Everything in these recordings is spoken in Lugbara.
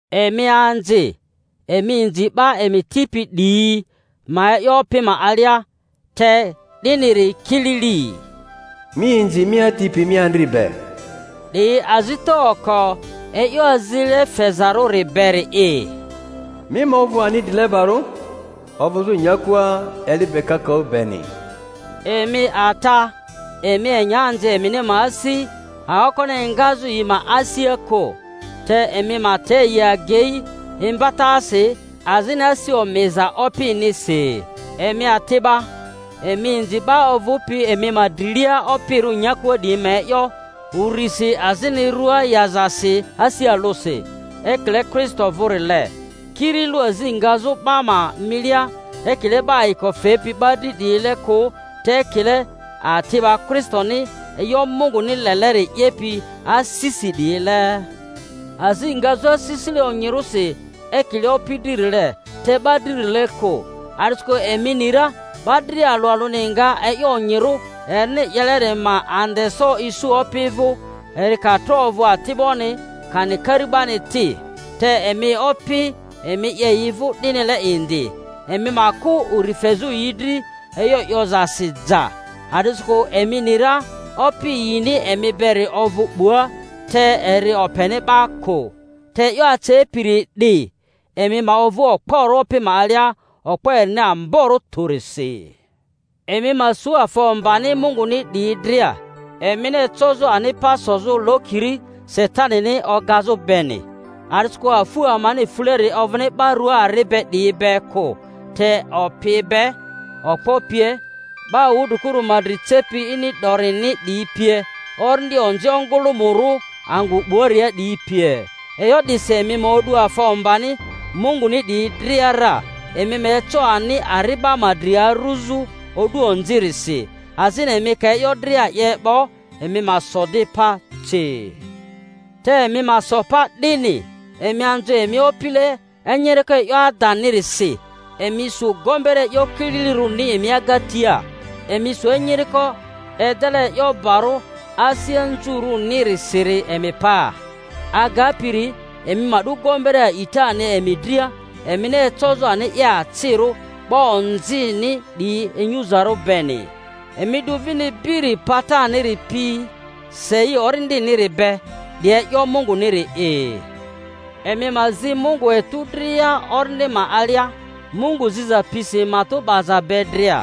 Emi anzi, emi inzi 'ba emi tipi 'diyi ma e'yo Opi ma alia, te 'diniri kilili. Mi inzi mi ati pi mi andri be ('di azita oko e'yo azile fezarᴜri beri'i), mi ma ovᴜ ani drilebarᴜ, ovᴜzᴜ nyakua eli be kakaᴜ beni. Emi ata, emi enya anzi emini ma asi aokoni engazᴜ yi ma asia kᴜ, te emi ma te yi agei imbatasi azini asi omiza Opinisi. Emi ati'ba, emi inzi 'ba ovᴜpi emi ma drilia opirᴜ nyakua 'diyi ma e'yo urisi azini rua yazasi asi alᴜsi, ekile Kristo vᴜrile; kiri lᴜ azi ngazᴜ 'ba ma milia ekile 'ba ayiko fepi 'ba dri 'diyile kᴜ, te ekile ati'ba Kristoni e'yo Munguni leleri 'yepi asisi 'diyile, azi ngazᴜ asisile onyirᴜsi ekile Opi dririle, te 'ba dririle kᴜ, a'disikᴜ emi ni ra 'ba dria alᴜ alᴜni nga e'yo onyirᴜ erini 'yeleri ma andeso isu Opi vᴜ, eri ka tro ovᴜ ati'boni kani kari'bani ti. Te emi opi, emi 'ye yi vᴜ 'dinile indi, emi ma kᴜ uri fezᴜ yi dri e'yo 'yozasi ja, a'disikᴜ emi ni ra Opi yini emi beri ovᴜ 'bua, te eri openi 'ba kᴜ. Te e'yo acepiri 'di, emi ma ovᴜ okporᴜ Opi ma alia, okpo erini amborᴜ tᴜrisi. Emi ma su afa ombani Munguni 'diyi dria, emini ecozᴜ ani pa sozᴜ lokiri Satanini ogazᴜ beni. A'disikᴜ afu amani fuleri ovᴜni 'ba rua ari be 'diyi be kᴜ, te opi be, okpo pie, 'ba wudrikuru ma dri cepi ini 'dorini 'diyi pie, orindi onzi ongᴜlᴜmᴜrᴜ angᴜ 'buaria 'diyi pie. E'yo 'disi emi ma o'du afa ombani Munguni 'diyi dria ra, emi ma eco ani ari'ba ma dri aruzᴜ o'du onzirisi, azini emi ka e'yo dria 'ye 'bo emi ma so di pa ci. Te emi ma so pa 'dini, emi anzu emi opile enyiriko e'yo adanirisi, emi su gombere e'yo kililirᴜrini emi agatia, emi su enyiriko edele e'yo barᴜ asi anzurᴜrinisiri emi paa; aga-piri emi ma 'du gombere a'itani emi dria, emini ecozᴜ ani 'ye acirᴜ 'ba onzini 'diyi inyuzarᴜ beni. Emi 'du vini biri pataniri pi, sei Orindiniri be, 'di e'yo Munguniri'i. Emi ma zi Mungu etu dria Orindi ma alia, Mungu ziza pisi matᴜ 'baza be dria.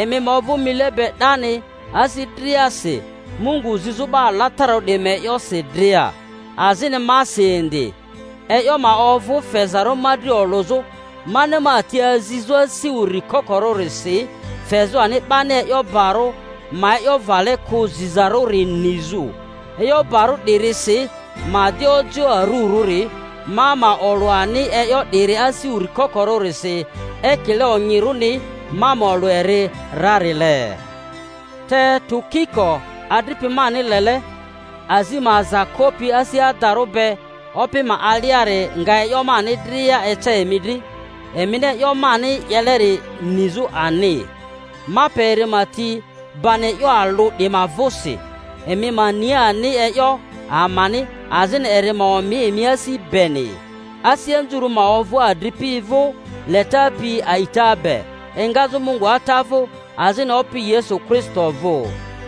Emi ma ovᴜ mile be 'dani asi driasi, Mungu zizᴜ 'ba alatararᴜ 'diyi ma e'yosi dria, azini masi indi, e'yo ma ovᴜ fezarᴜ ma dri olᴜzᴜ, mani ma ti azizᴜ asi uri kokorᴜrisi, fezᴜ ani 'bani e'yo barᴜ ma e'yo vale kᴜ zizarᴜri nizᴜ, e'yo barᴜ 'dirisi ma di ojioᴜ arurᴜri; ma ma olᴜ ani e'yo 'diri asi uri kokorᴜrisi, ekile onyirᴜni ma ma olᴜ eri rarile. Te Tukiko adripi mani lele, azi ma aza kopi asi adarᴜ be Opi ma aliari nga e'yo mani dria ece emi dri, emini e'yo mani 'yeleri nizᴜ ani. Ma pe eri ma ti bani e'yo alᴜ 'di ma vᴜsi, emi ma ni ani e'yo amani, azini eri ma omi emi asi beni. Asi anzurᴜ ma ovᴜ adripi vᴜ, leta pi a'ita be, engazᴜ Mungu Ata vᴜ azini Opi Yesu Kristo vᴜ.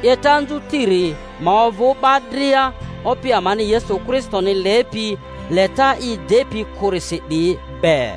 'Yeta anzutiri ma ovᴜ 'ba dria Opi amani Yesu Kristoni lepi leta i depi kᴜrisi 'diyi be.